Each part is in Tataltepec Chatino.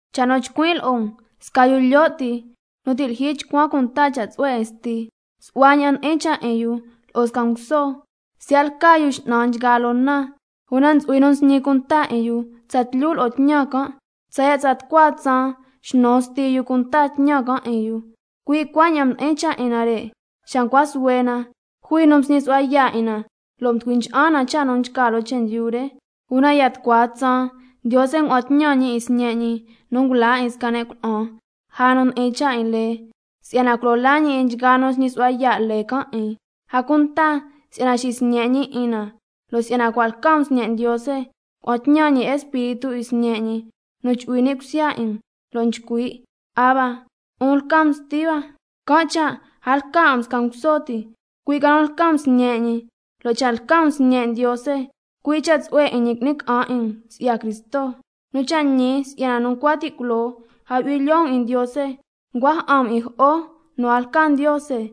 Cha' nu nchcuin' lo'o um, sca yu lyo' ti nu ti' lyijyi chcuan cunta cha' tsu'hue 'in sti, su'hua ña'an ndi'in cha' 'in yu lo'o sca nguso, siya' lca yu x'nan nchgaa loo na. Una ntsu'hui nu nsñi cunta 'in yu tsatlyu lo'o tñan can', tsaya' tsa tucua tsaan xnu sti yu cunta tñan can' 'in yu. Cui' cuaña'an mdi'in cha' 'in nare' xa ncua suhue na, jui nu msñi su'hua yaa' 'in na lo' mducui ncha'an na scasca cha' nu nchca loo chendyu re. Una ya tucua tsaan, Ndiose ngua'an tñan ñi 'in Sñe' ñi nu ngula 'in sca ne' cuna'an lja nu ndi'in cha' 'in lee, si'yana culo laa ñi 'in nchgaa nu nsñi su'hua yaa' lee can' 'in, a cunta si'yana xisñe' ñi 'in na. Lo' si'yana cua' lca um sñe' Ndiose, ngua'an tñan ñi Espíritu 'in Sñe' ñi nu chu'hui ni' cusya 'in um, lo' nchcui': ¡Abba, 'un lca um Sti hua! Can' cha' a lca 'a um sca nguso ti, cui' ca nu lca um sñe' ñi, lo' cha' lca um sñe' Ndiose, cui' cha' tsu'hue 'in ñi qui'ni ca'an 'in um si'ya Cristo. Nu cha' ñi si'yana nu ncua ti' culoo a yu'hui lyoo um 'in Ndiose, ncua ja'an um 'in scasca jo'o nu a lca Ndiose.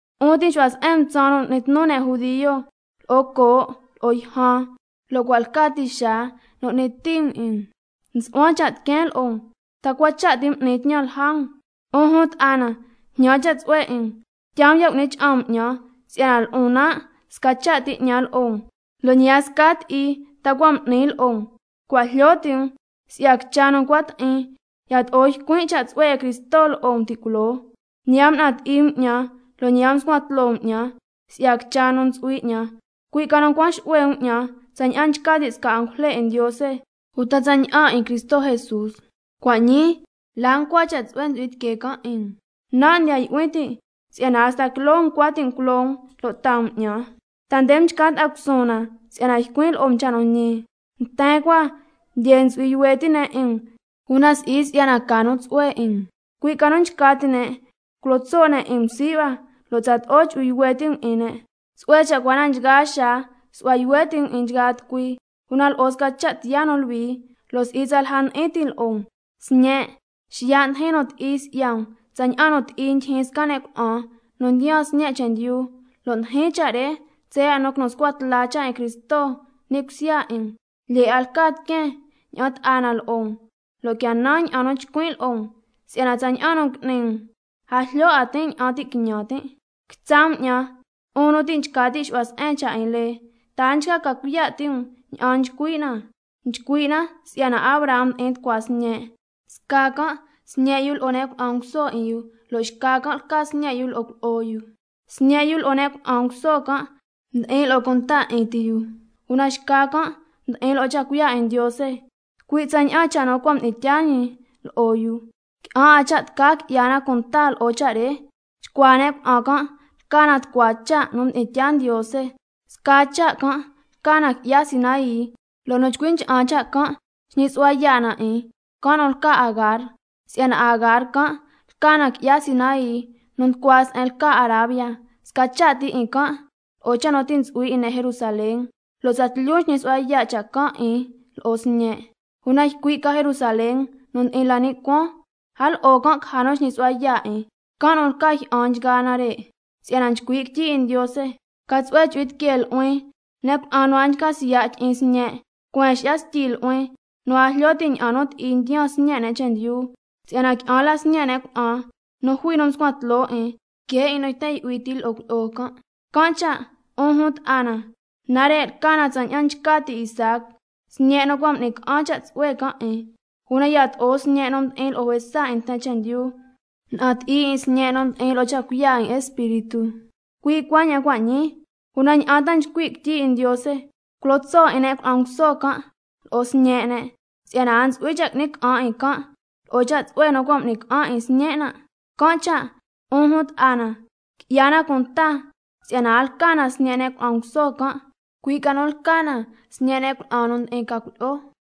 'Un ti' nxu'hua se'en um tsaan nu n'ni tnu ne' judio, lo'o coo' lo'o yjan, lo' cua' lca ti xaa nu n'ni ti um 'in um. Nsu'huan cha' tiqueen lo'o um, ¿ta cua cha' ti m'nin tñan si'ya um? 'Un jun ta'a na, jñan cha' tsu'hue 'in um, tyaa um ya' cu'ni cha'an um 'ñan si'yana lo'on nan' sca cha' ti 'ñan lo'o um, lo' ñi a sca ti'i ta cua' m'ni um lo'on. Cua' jlyo ti' um si'ya quicha nu ncua ti'in, yato'o ycuin' cha' tsu'hue 'in Cristo lo'o um ti' culoo. Ñi a mna'an ti'i um lo' ñi a mscuan tloo um 'ñan si'ya quicha nu ntsu'hui 'ñan, cui' ca nu ncuan xu'hue um 'ñan tsaña'an nchca ti' sca angujle 'in Ndiose, uta tsaña'an Cristo Jesús. Cua' ñii, ¿la ncua cha' tsu'hue ntsu'hui tiquee can' 'in um? Nan' ndiya yu'hui tin' si'yana hasta quiloo um ncua ti' um culo um lo' taa um 'ñan. ¿Ta nde mchca ta'a cusuun na si'yana ycuin' lo'o um cha' nu ñi? Nten cua, lyee ntsu'hui yuhue ti' ne' 'in um, una si'i si'yana ca nu tsu'hue 'in um, cui' ca nu nchca ti' ne' culo tso' ne' 'in um sii' hua lo' tsato'o chu'hui yuhue ti' um 'in ne'. Tsu'hue cha' cua na nchgaa xaa su'hua yuhue ti' um 'in nchgaa tucui, una lo'o sca cha' tiyaa nu luhui, lo' si'i tsalja ndi'in tin lo'o um. Sñen', cua' xiya' ndijin nu ti'i si'ya um tsaña'an nu ti'i ndyijyin sca ne' cuna'an nu ndiyaan sñe' chendyu, lo' tijin cha' re tsaya' nu quinu scua tla cha' 'in Cristo ni' cusya 'in um. Lyee 'a lca tiqueen ña'an ta'a na lo'o um, lo' quia nan ña'an nu chcuin' lo'o um, si'yana tsaña'an nu ngui'ni um a jlyo 'a tin' ña'an ti' quiñan tin'. Quitsa' um 'ñan, 'un nu ti' nchca ti' xu'hua se'en cha' 'in lee, ¿Ta na a nchca ca cuiya' ti' um ña'an nchcui' na? Nchcui' na si'yana Abraham mdi'in tucua sñe', sca can' sñe' yu lo'o ne' cuna'an nguso 'in yu, lo' xca can' lca sñe' yu lo'o cuilyi'o yu. Sñe' yu lo'o ne' cuna'an nguso can' mdi'in lo'o cunta 'in ti yu, una xca can' mdi'in lo'o cha' cuiya' 'in Ndiose, cui' tsaña'an cha' nu cua' mdi'in tyaa ñi lo'o yu. Qui'an 'a cha' tca qui'ya na cunta lo'o cha' re. Chcuaa ne' cuna'an can' lca na tucua cha' nu mdi'in tyaa Ndiose. Sca cha' can' mdi'in tyaa ñi lca qui'ya Sinai, lo' nu chcui ncha'an cha' can' xñi su'hua yaa' na 'in, can' nu lca Agar. Si'yana Agar can' lca na qui'ya Sinai nu nducua se'en lca Arabia, sca cha' ti 'in can' lo'o cha' nu ti' ntsu'hui 'in ne' Jerusalén, lo' tsatlyu nxñi su'hua yaa' cha' can' 'in lo'o sñe'. Una ycui' ca Jerusalén nu ndi'in la ni' cuaan, a lo'o can' caja nu xñi su'hua yaa' 'in, can' nu lca jyi'an nchgaa nare'. Si'yana nchcui' quityi 'in Ndiose: ¡—Ca tsu'hue chu'hui tiquee nu'huin ne' cuna'an nu a nchca siya' tyi'in sñe'! ¡Cueen xi'ya styi nu'huin nu a jlyo ti' ña'an nu ti'i ndiyaan sñe' ne' chendyu! Si'yana qui'an la sñe' ne' cuna'an nu jui nu mscuan tloo 'in, que 'in nu yten yu'hui ti lo'o cuilyi'o can'—. Can' cha' 'un jun ta'a na, nare' lca na tsaña'an nchca ti' Isaac, sñe' nu cua' m'ni ca'an cha' tsu'hue can' 'in. Una yato'o sñe' nu mdi'in lo'o juesa 'in nten chendyu mna'an ti'i 'in sñe' nu mdi'in lo'o cha' cuiya' 'in Espíritu, cui' cuaña'an cua' ñii. ¿Una ña'an ta nchcui' quityi 'in Ndiose? —Culo tso' 'in ne' cuna'an nguso can' lo'o sñe' ne', si'yana a ntsu'hui cha' qui'ni ca'an 'in can' lo'o cha' tsu'hue nu cua' m'ni ca'an 'in sñen' nan'—. Can' cha' 'un jun ta'a na, qui'ya na cunta si'yana a lca na sñe' ne' cuna'an nguso can', cui' ca nu lca na sñe' ne' cuna'an nu ndi'in ca cuilyi'o.